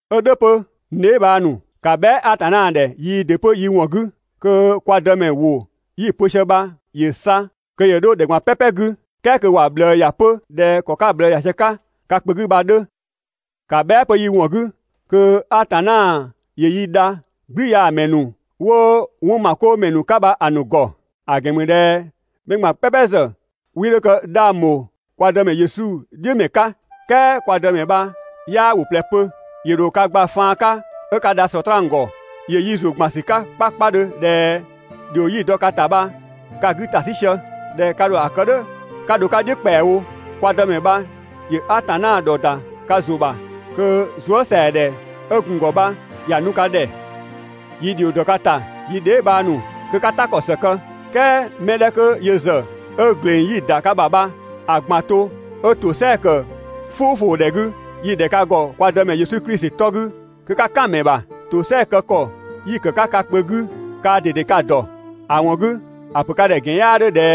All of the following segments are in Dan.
'Ö "dhʋ̈ 'pö, n dheebhang ‑nu, ‑ka bhɛa" Atanna ‑dhɛ yii ‑dɩ 'pö yi ‑wɔn 'gü kö kwa Dëmɛ ‑wʋ yi‑ pö sië bha ‑yö sa kö ‑yö 'dho ‑dhɛ ꞊gban "pɛpɛ 'gü, "kɛɛ kö ‑wa ꞊bhlëë ‑ya 'pö ꞊dhɛ ‑kɔ 'ka‑ ꞊bhlëë ‑ya sië 'ka ka kpö 'gü bha‑ 'dhö. ‑Ka bhɛa" 'pö yi ‑wɔn 'gü kö Atanna ‑yö yi dha "gblüyaamɛ ‑nu 'wo 'wɔnmakoomɛ ‑nu 'ka bha‑ ‑nu ‑gɔ. ‑A ‑gɛn ‑mü ꞊dhɛ mɛ ꞊gban "pɛpɛ ‑zë 'wii 'dho kë 'dhang bho kwa Dëmɛ Yesu "dhiʋ̈ ‑mɛ 'ka. "Kɛɛ kwa Dëmɛ bha 'yaa ‑wʋ ꞊plɛ pö, ‑yö ‑dho ka gba faan 'ka 'ö ka dha Sɔtraan ‑gɔ. ‑Yö yi ‑zʋ ‑gban ‑sü 'ka 'kpakpadhö ꞊dhɛ ‑dhio 'yi‑ dɔ ka ‑ta bha ka‑ 'gü ‑ta 'sü sië, ꞊dhɛ ka ‑dho ‑a kë "dhʋ̈ 'ka dho‑ 'ka "dhiʋ̈ ‑kpɛawo. Kwa Dëmɛ bha ‑yö Atanna ‑dhɔ ‑da 'ka ‑zʋ ‑bha, kö zuësɛadhɛ 'ö gun‑ ‑gɔ bha ‑ya nu ka ‑dhɛ. Yi ‑dhio ‑dɔ ka ‑ta, yi dheebhang ‑nu, kö 'ka "ta ‑kɔ ‑së kë, "kɛɛ mɛ 'dhɛ 'kö yö ‑zë 'ö ‑gleng 'yi‑ ‑da ka ‑bha bha‑ ꞊gban to 'ö ‑tosɛa ‑kë "fʋʋfʋʋdhɛ 'gü, yi‑ ‑dhɛ ka ‑gɔ kwa Dëmɛ Yesu Klisi 'tɔ 'gü kö 'ka "kan‑ ‑mɛ ‑bha. ‑Tosɛa kë ‑kɔ 'yi‑ ‑kë 'ka ka kpö 'gü kaa ꞊dede ka‑ ‑dɔ. ‑A ‑wɔn 'gü, ‑a ‑pö ka ‑dhɛ ‑gɛn 'yaa 'dhö ꞊dhɛ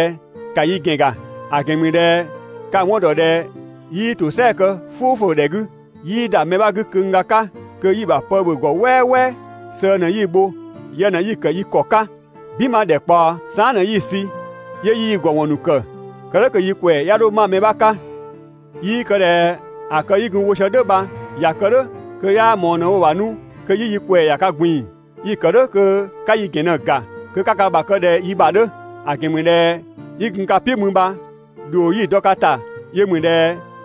‑ka yi ‑gɛn ‑ga; ‑a ‑gɛn ‑mü ꞊dhɛ ka‑ 'wɔn ‑dɔ ꞊dhɛ 'yii ‑tosɛa kë "fʋʋfʋʋdhɛ 'gü. 'Yii ‑da mɛ 'bha 'gü köngga 'ka kö yi‑ ‑bha pë ‑bhö ‑gɔ "wɛɛwɛɛ, sëë ꞊në 'yi‑ bho, yë ꞊në 'yi‑ ‑kë yi ‑kɔ 'ka "binma ‑dhɛkpaɔ, saan" ꞊në 'yi‑ sü 'yö 'yi yi ‑gɔ ‑wɔn ‑nu ‑kë, kë "dhʋ̈ kö yi ‑kwɛɛ 'ya 'dho 'ma mɛ 'bha 'ka. 'Yii kë ꞊dhɛ ‑a kë 'yi gun‑ wo sië "dhʋ̈ bha, ꞊ya kë "dhʋ̈ kö 'yaa ꞊mɔɔ ꞊në‑ wo‑ ‑bha 'nu kö 'yi yi ‑kwɛɛ ‑ya ka ꞊gbin‑. Yi‑ ‑kë "dhʋ̈ kö 'ka yi ‑gɛn ꞊në‑ ‑ga kö 'ka ka ‑bha kë ꞊dhɛ yi ‑bha 'dhö. ‑A ‑gɛn ‑mü ꞊dhɛ 'yi gun ka "piʋ̈ mü bha ‑dhio 'yi‑ dɔ ka ‑ta yö ‑mü ꞊dhɛ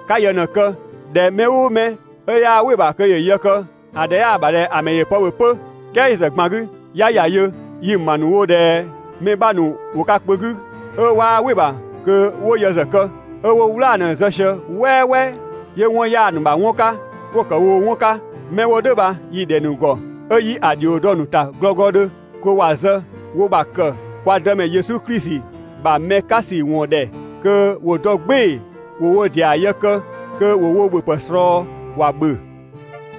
'ka yë ꞊në‑ kë. ꞊Dhɛ mɛ "ʋʋ mɛ 'ö 'yaa "wɩ‑ ‑bha kö ‑yö yë kë, ‑a ‑dhɛ 'yaa ‑bha ꞊dhɛ‑ ‑mɛ ‑yö pë ‑bhö 'pö. "Kɛɛ yö ‑zë ꞊gban 'gü, 'ya ‑ya yö, yi‑ ‑ma ‑nu wo ꞊dhɛ mɛ 'bha ‑nu ‑wo ka kpö 'gü 'ö 'waa "wɩ‑ ‑bha kö ‑wo yë ‑zë kë, 'ö 'wo "wlaa‑ ꞊në zë sië "wɛɛwɛɛ 'yö 'wɔn 'yaa‑ ‑nu ‑bha 'wɔn 'ka 'wo‑ ‑kë woo‑ 'wɔn 'ka. 'Mɛ 'wo "dhʋ̈ bha yi‑ ‑dhɛ ‑nu ‑gɔ 'ö 'yi‑ ‑dhio dɔ‑ ‑nu ‑ta glɔglɔdhö kö ‑wa zë wo ‑bha ‑kë kwa Dëmɛ Yesu Klisi ‑bha mɛ 'ka ‑sü ‑wɔn ‑dhɛ kö ‑wo dɔ "gbɩɩ‑ ‑wo wo ‑dɩa yë kë kö ‑wo wo ‑bhöpë ꞊slɔɔ ‑wa ‑bhö.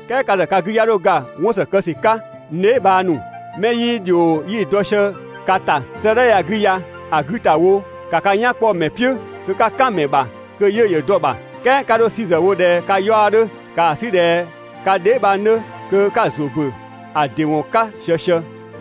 "Kɛɛ ka ‑zë ka 'gü 'ya 'dho ga 'wɔn ‑së kë ‑sü 'ka, n dheebhang ‑nu. 'Mɛ 'yii ‑dhio 'yi dɔ sië ka ‑ta 'sëëdhɛ ya 'gü ya‑ 'gü ‑ta wo, ‑ka ka "yan 'kpɔ‑ ‑mɛ "piʋ̈ kö 'ka "kan‑ ‑mɛ ‑bha kö 'yiʋ̈‑ ‑yö dɔ‑ ‑bha. "Kɛɛ 'ka 'dho‑ 'sü ‑zë wo ꞊dhɛ ka 'yaɔ‑ 'dhö, ‑kaa 'sü ꞊dhɛ ka dheebhang 'dhö kö 'ka‑ ‑zʋ ‑bö ‑a ‑dɩ ‑wɔn 'ka ꞊siësië.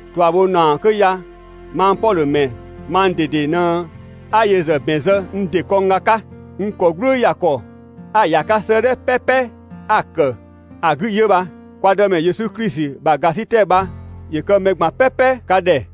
꞊Tuabhonaɔ 'kö ya mang Pɔdhö ‑mɛ mang ꞊dede ꞊në 'a‑ yö ‑zë ‑bɛn zë n ‑dɩ kɔngga 'ka. N ‑kɔ "glʋʋ ‑ya ‑kɔ 'a‑ ‑ya 'ka 'sëëdhɛ "pɛpɛ 'a‑ ‑kë ‑a 'gü 'yö bha. Kwa Dëmɛ Yesu Klisi ‑bha ‑gasitɛ bha ‑yö kë mɛ ꞊gban "pɛpɛ ka ‑dhɛ.